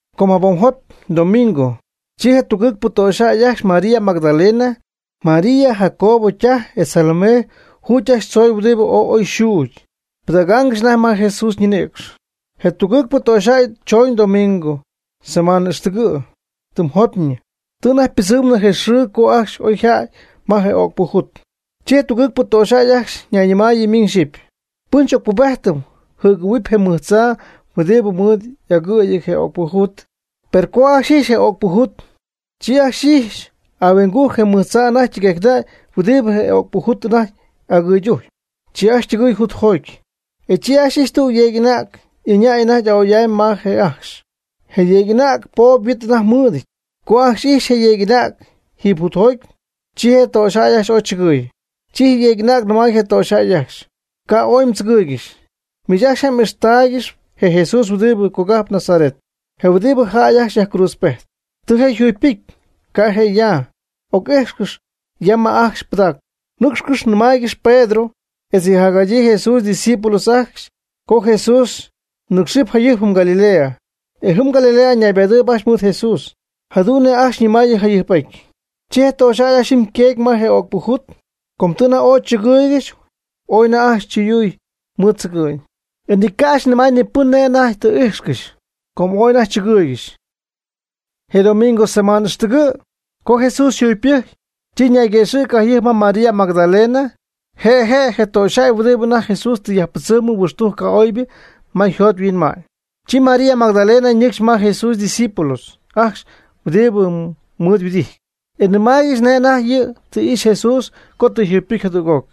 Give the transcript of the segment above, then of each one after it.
Com jabom jopy, domingo, chi je tugɨɨg töxyjäy ajcxy María Magdalena, María Jacobo ytaj etz Salomé juy ajcxy tzoy huɨdibɨ ooy oy xuugy, pɨdägaangɨxy anajty ma Jesús ñinïcx. Je tugɨɨgpɨ töxyjäy chooñ domingo, semaan ixtɨgɨ', tɨm jopyñɨ. Tɨ anajty ypɨdzɨmnɨ je xɨɨ co ajcxy oyjädy ma je öcpɨ jut. Chi je tugɨɨgpɨ töxyjäy ajcxy nayñɨmaayɨ miñ xyɨpy: ―¿Pɨn xy'ocpubéjtɨm jɨgɨ̈huɨpy je mɨj tzaa huɨdibɨ mɨɨd agɨɨyɨty je öcpɨ jut? Per co ajcxy ijxy je öcpɨ jut, chi ajcxy ijxy ahuingujc je mɨj tzaa anajty ytɨguejcnäy huɨdibɨ je öcpɨ jut anajty agɨɨydujcp. Chi ajcxy ytɨgɨɨy jutjoty. E chi ajcxy ijxy tüg yeeg'anäg ɨñäy anajty a'oy'amy ma je' ajcxy. E je yeeg'anäg poob huit anajty ymɨɨd. Co ajcxy jadu'n ijxy je yeeg'anäg jiiby jutjoty, chi je töxyjäy ajcxy ooy chɨgɨɨy. Chi je yeeg'anäg nɨmay je töxyjäy ajcxy: ―Ca' ooy mdzɨgɨɨygɨxy. Miich ajcxy je' m'ijxtaaygɨxp je Jesús huɨdibɨ cogajp Nazaret, je huɨdibɨ jäy ajcxy yajcruutzpejt. Tɨ je' yjugypɨcy. Ca' je' ya. Oc'íjxcɨx ya ma ajcxy pɨdaaccɨ. Nɨ́cxcɨx, nɨmaaygɨx Pedro etz yɨ jacjadyii Jesús ydiscípulos ajcxy co Jesús nɨ́cxɨp jayɨjp jɨm Galilea, e jɨm Galilea ñaybadɨɨyb ajcxy mɨɨd Jesús, jadu'n nej ajcxy ñɨmaayɨ jayɨjp'aty. Chi je töxyjäy ajcxy jɨm yqueegy ma je öcpɨ jut, com tɨ anajty ooy chɨgɨɨygɨxy. Ooy anajty ajcxy chɨyuy mɨɨd tzɨgɨ'ñ. E ni ca' ajcxy nɨmay ni pɨn nej anajty tɨ íjxcɨxy, com ooy anajty chɨgɨɨygɨxy. Je domingo, semana ixtɨgɨ', co Jesús yjugypɨcy, chi ñayguëxɨ̈cɨ jayɨjp ma María Magdalena, je' je' je töxyjäy huɨdibɨ anajty Jesús tɨ yajpɨdzɨmɨ huɨxtujc ca'oybɨ ma yjot yhuinma'ñ. Chi María Magdalena ñɨcxy ma Jesús ydiscípulos ajcxy huɨdibɨ mɨɨd yhuɨdijty, e nɨmaaygɨxy nej anajty yɨ' tɨ ixy Jesús co tɨ yjugypɨcy jadüg'oc.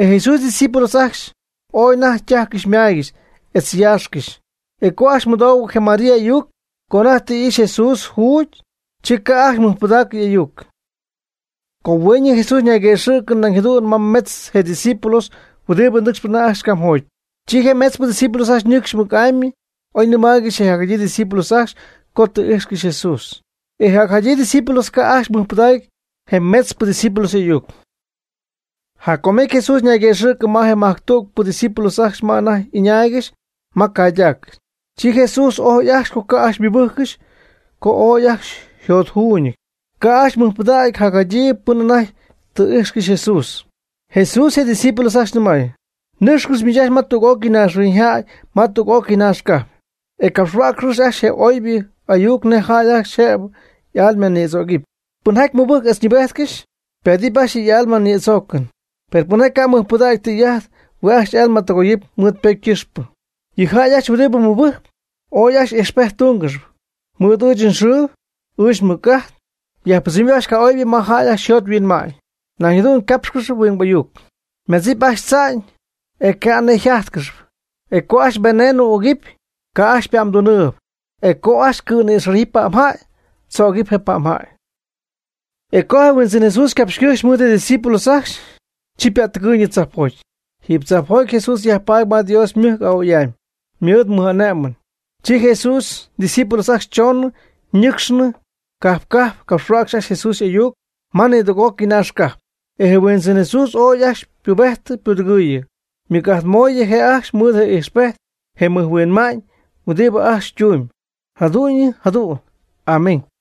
E Jesús ydiscípulos ajcxy ooy anajty ytájycɨxy ymáygɨxy etz yaaxcɨxy. E co ajcxy mɨdoohuɨ je María y'ayuc, co anajty tɨ ixy Jesús juugy, chi ca' ajcxy mɨjpɨdaacɨ y'ayuc. Co hueeñɨ, Jesús ñayguëxɨ̈cɨ nañ jadu'n ma metz je' ydiscípulos huɨdibɨ ñɨcxp anajty ajcxy camjoty. Chi je metzpɨ discípulos ñɨcxy ajcxy mɨc'amy oy nɨmaaygɨxy je jacjadyii discípulos ajcxy co tɨ íjxcɨxy Jesús. E je jacjadyii discípulos ca' ajcxy mɨjpɨdaacɨ je metzpɨ discípulos y'ayuc. Jac com jecy, Jesús ñayguëxɨ̈cɨ ma je majctügpɨ discípulos ajcxy ma anajty y'ɨñaaygɨxy ma caydac. Chi Jesús ojy ajcxy co ca' ajcxy mɨbɨ́jccɨxy co ooy ajcxy yjot yjuuñɨty, ca' ajcxy mɨjpɨdägy jacjadyii pɨn anajty tɨ y'íjxcɨxy Jesús. Jesús je' ydiscípulos ajcxy nɨmay: ―Nɨ́cxcɨx miich ajcxy ma tüg'ócɨy naaxhuiñyjäy, ma tüg'ócɨy naax cajp, e capxhuäcxcɨx ajcxy je oybɨ ayuc nej jäy ajcxy jëb y'almanïdzögɨpy. Pɨnjaty mɨbɨjc etz ñɨɨbejtcɨxy, ypaadɨp ajcxy y'almanïdzoocɨn. Per, pɨnjaty ca' mɨjpɨdägy tɨy'ajt hue' ajcxy y'alma tɨgoyɨp mɨɨd ypocy ycɨxpɨ. Yɨ jäy ajcxy huɨdibɨ mɨbɨjcp, ooy ajcxy ijxpejt túngɨxɨpy. Mɨɨd ɨɨch nxɨɨ ɨɨch nmɨc'ajt yajpɨdzɨmɨpy ajcxy ca'oybɨ ma jäy ajcxy yjot yhuinma'ñ. Nañ jadu'n ycápxgɨxɨpy huingbɨ ayuc. Ymadzɨpy ajcxy tza'ñ, e ca' nej yjájtcɨxɨpy. E co ajcxy veneno ügɨp, ca' ajcxy ypa'mdunɨɨb. E co ajcxy cɨ̈nïxájɨpy pa'mjäy, tzögɨp je pa'mjäy. E co je Huindzɨn Jesús ycapxy ycɨjxy mɨɨd je' ydiscípulos ajcxy, chi ypätɨgɨɨyñɨ tzajpjoty. Jiiby tzajpjoty Jesús yajpaady ma Dios ymɨjc a'oy'amy, mɨɨd mɨj'ane'mɨn. Chi Jesús ydiscípulos ajcxy chooñ ñɨ́cxcɨxy cajp cajp capxhuäcxy ajcxy Jesús y'ayuc ma nidüg'ócɨy naax cajp. E je Huindzɨn Jesús ooy ajcxy ypubejtɨ ypudɨgɨɨyɨ, mɨc'ajt moy je' ajcxy mɨɨd je ijxpejt je mɨjhuinma'ñ huɨdibɨ ajcxy tumyb. Jadu'ñyɨ jadu'n. Amén.